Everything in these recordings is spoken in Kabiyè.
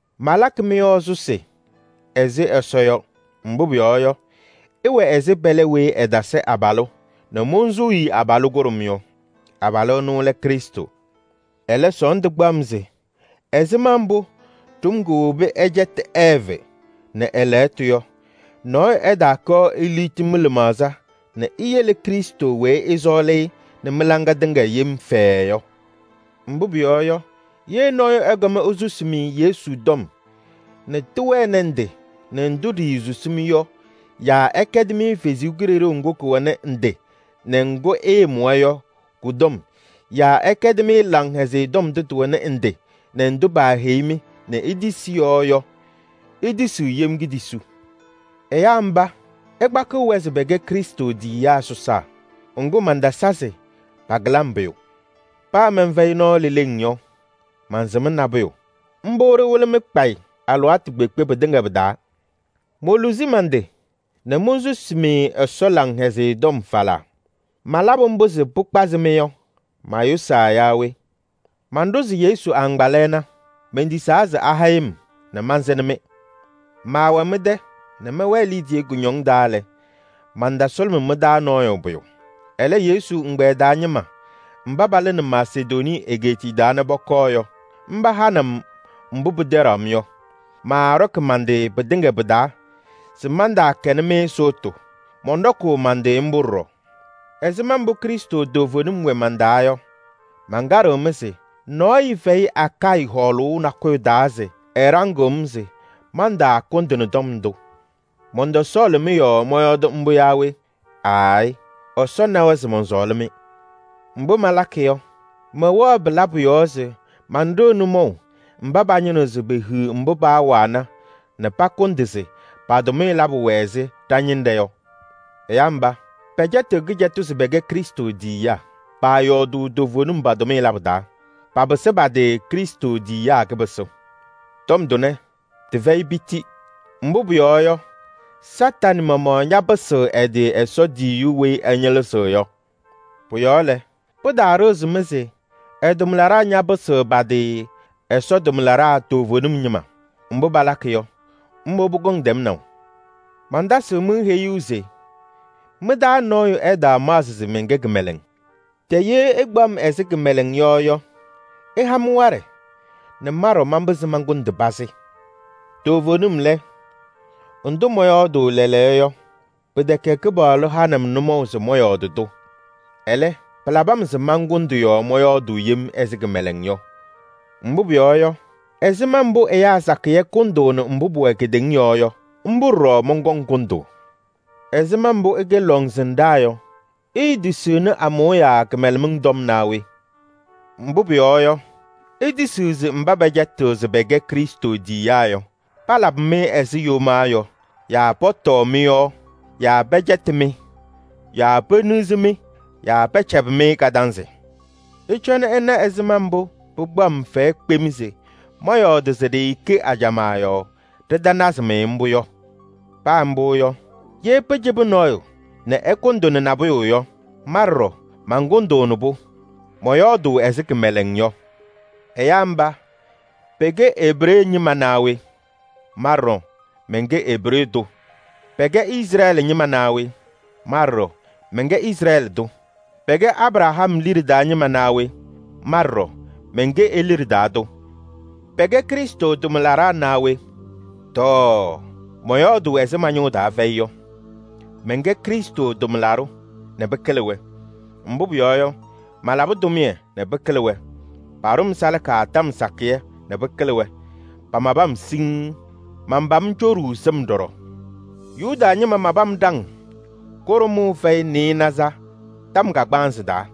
Malakɩ mɩ-yɔɔ sʋsɩ ɛzɩ Ɛsɔ yɔ. Mbʋ pʋyɔɔ yɔ, ɩwɛ ɛzɩ pɛlɛ weyi ɛtasɩ abalʋ nɛ monsuu-i abalʋ kʋɖʋm yɔ. Abalʋ ɛnʋ lɛ Krɩstʋ. Ɛlɛ, sɔɔndʋ kpaɣ-m se ɛzɩma mbʋ ɖʋm kowobi ɛcɛtɩ Ɛɛvɩ nɛ ɛ-ajiitu yɔ, nɔɔyʋ ɛɛtaakɔɔ eliɣti mɩ-lɩmaɣza nɛ iyele Krɩstʋ weyi ɩsɔɔlɩ-ɩ nɛ mɩ-laŋɩyɛ tɩŋa yem fɛɛɛ yɔ. Mbʋ pʋyɔɔ yɔ, ye nɔɔyʋ ɛkɔm esusi-mɩ Yesu tɔm nɛ tɩwɛnɩ ndɩ nɛ ndʋ ɖiisusi-mɩ yɔ yaa ɛkɛdɩ-mɩ kalɩzaɣ ŋga kɛwɛnɩ ndɩ nɛ ŋga ɩɩmʋwa yɔ kɔ-tɔm yaa ɛkɛdɩ-mɩ Laŋhɛzɩyɛ Tɔm ndʋ tɩwɛnɩ ndɩ nɛ ndʋ paaheyi-mɩ nɛ itisi yɔ yɔ, itisiɣ yem kpakʋ. Ɛyaa mba, ɩkpakɩɣ-wɛ se pɛkɛ Krɩstʋ tiyiyaa sɔsaa. Ŋgʋ, mantasa se pakɩlɩ-m pʋyʋ! Paa mɛnfɛyɩ nɔɔ leleŋ yɔ, mansɩm nabʋyʋ. Mbʋ ɖɩwɩlɩ-mɩ kpayɩ alɩwaatʋ kpeekpe pɩtɩŋa pɩ-taa. Moluzi man-tɩ nɛ monsusi-mɩ Ɛsɔ Laŋhɛzɩyɛ Tɔm falaa. Malabʋ mbʋ se pɩkpazɩ-mɩ yɔ, mayʋsaa yaa we? Manɖʋzɩ Yesu agbaa lɛɛna. Mentisaa se ahɛyɩ-m nɛ mansɩnɩ-mɩ. Maawɛ mɩ-tɛ nɛ mɛwɛɛ kɩcɛyɩm taa lɛ, mantasʋlʋmɩ mɩ-taa nɔɔyʋ pʋyʋ. Ɛlɛ, Yesu ɛgbɛyɛ taa ñɩma mba palɩnɩ Masedonii egeetiye nɛ pɔkɔɔ yɔ, mba hanɩ-m mbʋ pɩtɛɖaɣ-m yɔ. Maaɖɔkɩ man-tɩ pɩtɩŋa pɩ-taa se mantaakɛnɩ-mɩ sʋʋtʋ, mɔnɖɔkʋʋ man-tɩ mbʋ ɖɔɖɔ. Ɛzɩma mbʋ Krɩstʋ toovenim wɛ man-taa yɔ, mankaɖɩɣ-mɩ se: nɔɔyʋ fɛyɩ Akayɩ hɔɔlʋʋ nakʋyʋ taa se ɛɖaŋɩɣ-m se mantaakʋndɩnɩ tɔm ndʋ. Mɔntɔsɔɔlɩ-mɩ yɔɔ mɔyɔɔdɩ mbʋ yaa we? Aayɩ! Ɛsɔ nawa se mɔnsɔɔlɩ-mɩ. Mbʋ malakɩ yɔ, mɛwɛɣ pɩ-labʋ yɔɔ se manɖɩɣ nʋmɔʋ mba pañɩnɩɣ se pehiɣ mbʋ paawana nɛ pakʋndɩ se pa-tʋmɩyɛ labʋ wɛ ɛzɩ ɖa-ñɩnɖɛ yɔ. Ɛyaa mba, pɛcɛtɩɣ kɩcɛtʋ se pɛkɛ Krɩstʋ tiyiyaa. Paayɔɔdʋʋ toovenim pa-tʋmɩyɛ labʋ taa. Papɩsɩ pa-tɩ Krɩstʋ tiyiyaa kɩpɩsʋ. Tɔm tʋnɛ tɩfɛyɩ piti. Mbʋ pʋyɔɔ yɔ, Satanɩ maɣmaɣ ñapɩsɩɣ ɛ-tɩ Ɛsɔ tiyiyu weyi ɛñɩlɩzɩɣ yɔ. Pʋ-yɔɔ lɛ, pɩtaaɖɩɣzɩ-mɩ se ɛ-tʋmlaɖaa ñapɩsɩɣ pa-tɩ Ɛsɔ tʋmlaɖaa toovenim ñɩma. Mbʋ palakɩ yɔ, mbʋ pɔkɔŋ tɛmnaʋ. Mantasɩɣ-mɩ heyuu se mɩ-taa nɔɔyʋ ɛtaamaɣzɩ se mɛnkɛ kɩmɛlɛŋ. Tɛ ye ɩkpaɣ-m ɛzɩ kɩmɛlɛŋ yɔ yɔ, ɩha-m waɖɛ nɛ ma ɖɔɖɔ manpɩzɩ mankʋndɩ pazɩ. Toovenim lɛ, ndʋ mɔyɔɔdʋʋ lɛɛlɛɛyɔ, pɩtɛkɛ Kɩpaɣlʋ hanɩ-m nʋmɔʋ se mɔyɔɔdɩ-tʋ. Ɛlɛ, pɩlabɩ-m se mankʋndɩ yɔɔ mɔyɔɔdʋʋ yem ɛzɩ kɩmɛlɛŋ yɔ. Mbʋ pʋyɔɔ yɔ, ɛzɩma mbʋ ɛyaa sakɩyɛ kʋndʋʋnɩ mbʋ pʋwɛ kedeŋa yɔɔ yɔ, mbʋ ɖɔɖɔ mɔnkɔŋ kʋndʋʋ. Ɛzɩma mbʋ ɩkɛ lɔŋsɩnɖaa yɔ, iitisiɣni amʋʋya kɩmɛlɛmɩŋ tɔm naa we? Mbʋ pʋyɔɔ yɔ, itisiɣ se mba pɛcɛtɩɣ se pɛkɛ Krɩstʋ tiyiyaa yɔ, palabɩ-mɩ ɛzɩ yomaa yɔ yaa pɔtɔɔ mɩ-yɔɔ yaa pɛcɛtɩ-mɩ yaa peniɣzi-mɩ yaa pɛcɛbɩ-mɩ kadanzɩ. Ɩcɔnɩ ɩna ɛzɩma mbʋ pɩkpaɣ-m fɛyɛ kpem se mɔyɔɔdɩ se ɖɩɩkɛ ajamaa yɔɔ ɖɩtanazɩ-mɩ mbʋ yɔ! Paa mbʋ yɔ, ye pɩcɩbɩ nɔɔyʋ nɛ ɛkʋndɩnɩ nabʋyʋ yɔ, ma ɖɔɖɔ mankʋndʋʋnɩ-pʋ. Mɔyɔɔdʋʋ ɛzɩ kɩmɛlɛŋ yɔ. Ɛyaa mba pɛkɛ Ebree ñɩma naa we? Ma ɖɔɖɔ mɛnkɛ Ebree tʋ. Pɛkɛ Izrɛɛlɩ ñɩma naa we? Ma ɖɔɖɔ mɛnkɛ Izrɛɛlɩ tʋ. Pɛkɛ Abraham liɖe taa ñɩma naa we? Ma ɖɔɖɔ mɛnkɛ e-liɖe taa tʋ. Pɛkɛ Krɩstʋ tʋmlaɖaa naa we? Tɔɔ! Mɔyɔɔdʋʋ ɛzɩ ma-ñʋʋ taa fɛyɩ yɔ. Mɛnkɛ Krɩstʋ tʋmlaɖʋ nɛ pɩkɩlɩ-wɛ. Mbʋ pʋyɔɔ yɔ, malabɩ tʋmɩyɛ nɛ pɩkɩlɩ-wɛ. Paɖʋ-m salaka tɔm sakɩyɛ nɛ pɩkɩlɩ-wɛ. Pamabɩ-m siŋŋ. Manpam coɖuu sɩm ɖɔɖɔ. Yuda ñɩma mabɩ-m ɖaŋ kʋɖʋmʋʋ fɛyɩ nɩɩnaza tɔm kagbaanzɩ taa.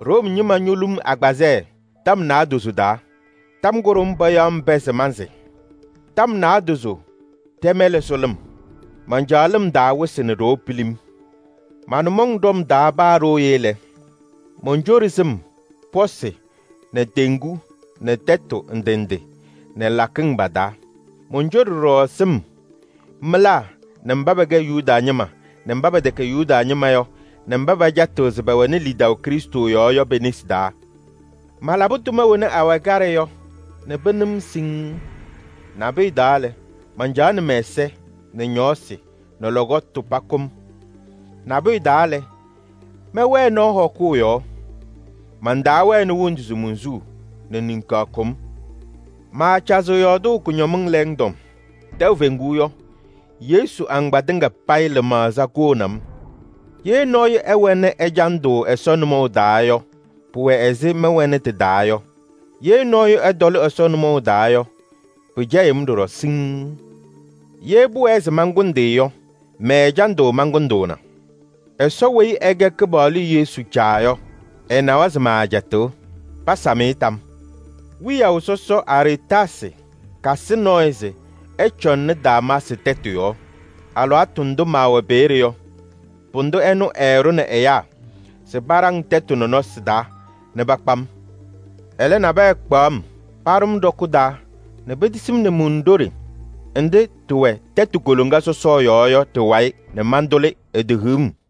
Room ñɩma ñolu-m agbazɛɛ tɔm naadozo taa. Tɔm kʋɖʋm payaɣ-m pɛɛ se mansɩ. Tɔm naadozo ɖɛ-mɛlɛ sʋ lɩm. Mancaɣ lɩm taa wɩsɩ nɛ ɖoo pilim. Ma-nʋmɔŋ ɖɔm taa paa ɖooye lɛ, moncoɖi sɩm pɔsɩ nɛ teŋgu nɛ tɛtʋ ndɩ ndɩ nɛ lakɩŋ pa-taa. Moncoɖi ɖɔɖɔ sɩm mɩlaa nɛ mba pɛkɛ Yuda ñɩma nɛ mba pɛtɛkɛ Yuda ñɩma yɔ nɛ mba pɛcɛtɩɣ se pɛwɛnɩ lidaʋ Krɩstʋ yɔɔ yɔ pe-nesi taa. Malabɩ tʋma wena awɛ kaɖɛ yɔ nɛ pɩnɩ-m siŋŋ. Nabʋyʋ taa lɛ, mancaɣnɩ mɛ-ɛza nɛ ñɔɔsɩ nɛ lɔkɔtʋ pakʋ-m. Nabʋyʋ taa lɛ, mɛwɛɛ nɔɔ hɔkʋʋ yɔɔ. Mantaawɛnɩ wondu se monsuu nɛ niŋkaɣ kʋ-m. Maacazɩɣ yɔɔdʋʋ kʋñɔmɩŋ lɛɛŋ tɔm. Tɛʋ feŋuu yɔ, Yesu agbaa tɩŋa payɩ lɩmaɣza kʋʋnɩ-m. Ye nɔɔyʋ ɛwɛnɩ ɛjandʋ Ɛsɔ nʋmɔʋ taa yɔ, pʋwɛ ɛzɩ mɛwɛnɩ tɩ-taa yɔ. Ye nɔɔyʋ ɛtɔlɩ Ɛsɔ nʋmɔʋ taa yɔ, pɩcɛyɩɣ-m ɖɔɖɔ siŋŋ. Ye pʋwɛɛ se mankʋndɩ yɔ, mɛ-ɛjandʋ mankʋndʋʋna. Ɛsɔ weyi ɛkɛ Kɩpaɣlʋ Yesu Caa yɔ, ɛnawa se maacɛtɩɣ! Pasam-ɩ tam! Wiyaʋ sɔsɔ Aretaasɩ kasɩ nɔɔyʋ se ɛcɔŋnɩ Damaasɩ tɛtʋ yɔɔ. Alɩwaatʋ ndʋ maawɛ peeye yɔ, pʋdʋ ɛnʋ ɛɛɖʋnɩ ɛyaa se paɖaŋ tɛtʋ nɔnɔsɩ taa nɛ pakpa-m. Ɛlɛ, nabɛyɛ kpaɣ-m paɖʋ ɖɔkʋ taa nɛ petisi-m nɛ mundoɖe nɖɩ ɖɩwɛ tɛtʋ koloŋa sɔsɔ yɔɔ yɔ ka-wayɩ nɛ mantʋlɩ, etehiɣ-m.